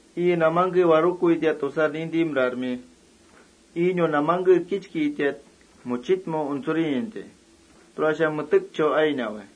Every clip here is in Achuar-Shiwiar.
Iinu namangkesha warukuita tusar nintimrarmi. Iinu namangke kichkitiat muchitmau untsurintai. Tura metekchau ainawai.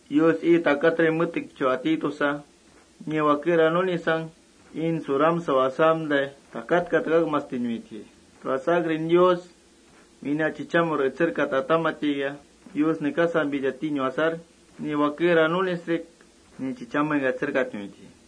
Yus ii takatrinka metekchau ati tusa, ni wakera nunisang iin suramsau asamtai takat takakmastinuitji. Tura asakrin: Wína chichamur etserkata turamataikia, Yus nekasampita tinu asar, ni wakera nunisrik ni chichamengka etserkatnuitji.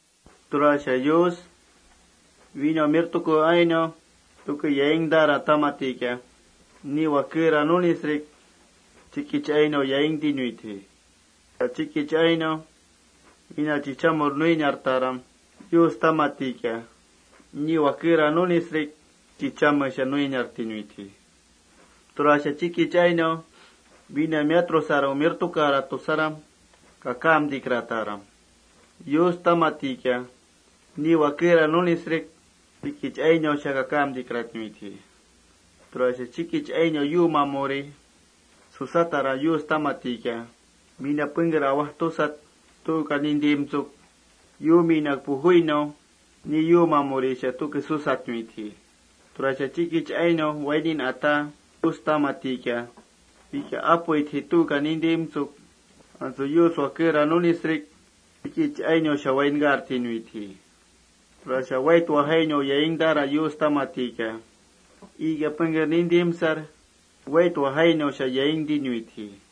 Tura Yus: Wína umirtuku ainau tuke yaingtaram turamataikia, ni wakera nunisrik chikich ainau yaingtinuitji. Tura Yus chikich ainau: Wína chichamur nuiniartaram turamataikia, ni wakera nunisrik ni chichamesha nuiniartinuitji. Tura: Chikich ainau wína miatrusarang umirtukarat tusaram kakamtikrataram, Yus turamataikia, ni wakera nunisrik chikich ainausha kakamtikratnuitji. Tura chikich ainau yuumamuri susataram, Yus turamataikia, wína pengker awajtusarat, tuuka nintimtsuk, yuuminak pujuinau ni yuumamurisha tuke susatnuitji. Tura Yus chikich ainau wainin ata turamataikia, wikia apuitjai, tuuka nintimtsuk, antsu Yus wakera nunisrik chikich ainausha wainkartinuitji. Tura Yus: Wait wajainau yaingtaram, turamataikia, iikia pengker nintimsar wait wajainausha yaingtinuitji.+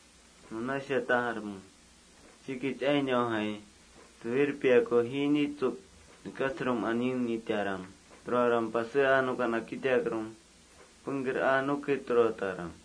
Nunasha tajarme: Chikich ainaujai suwirpiaku jiinitsuk nekasrum aneenitaram. Turaram pasé aa nuka nakitakrum, pengker aa nuke turataram.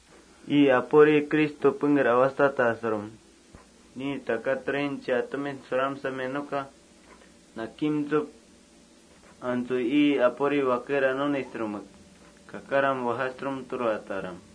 Ii Apuri Cristo pengker awajsatasrum, ni takatrin atumin suramsamia nuka nakimtsuk, antsu ii Apuri wakera nunisrumek kakaram wajasrum turataram.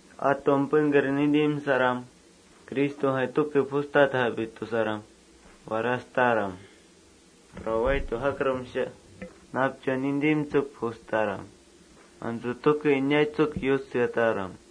Atumka pengker nintimsaram: Cristojai tuke pujustatjiapi tusaram warastaram. Tura wait wajakrumsha napchauka nintimtsuk pujustaram. Antsu tuke inaitsuk Yus seataram.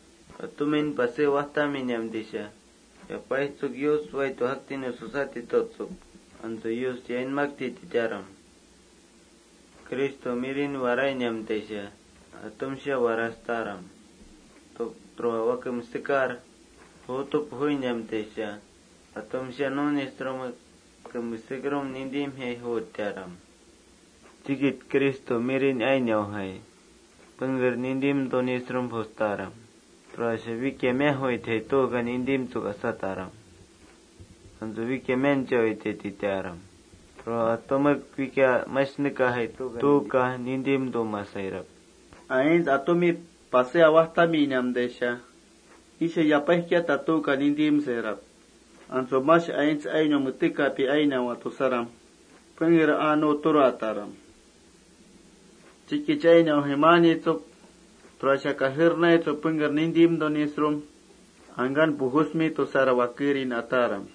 Atumin pasé awajtaminamtaisha yapaijtsuk: Yus wait wajaktiniun susati tutsuk, antsu Yus yainmakti titaram.+ Cristonu ainau warainamtaikia, atumsha nunisrumek warastaram. Tura wake mesekar juutu pujuinamtaisha, atumsha nunisrumek wake mesekrum juutiaram. Chikich aints ainaujai pengker nintimtunisrum pujustaram. Tura wikia miajuitjai, tuuka nintimtsuk asataram. Antsu wikia mianchawaitjai titaram. Tura atumek: Wikia mash nekajai, tuuka nintimtumasairap. Aints atumin pasé awajtaminamtaisha: Wisha yapaijkiataj tuuka nintimsairap. Antsu mash metek ainiaji tusaram pengker aa nu turataram. Chikich ainaujai kajernaitsuk pengker nintimtunisrum: Angkan pujusmi tusaram wakerin ataram.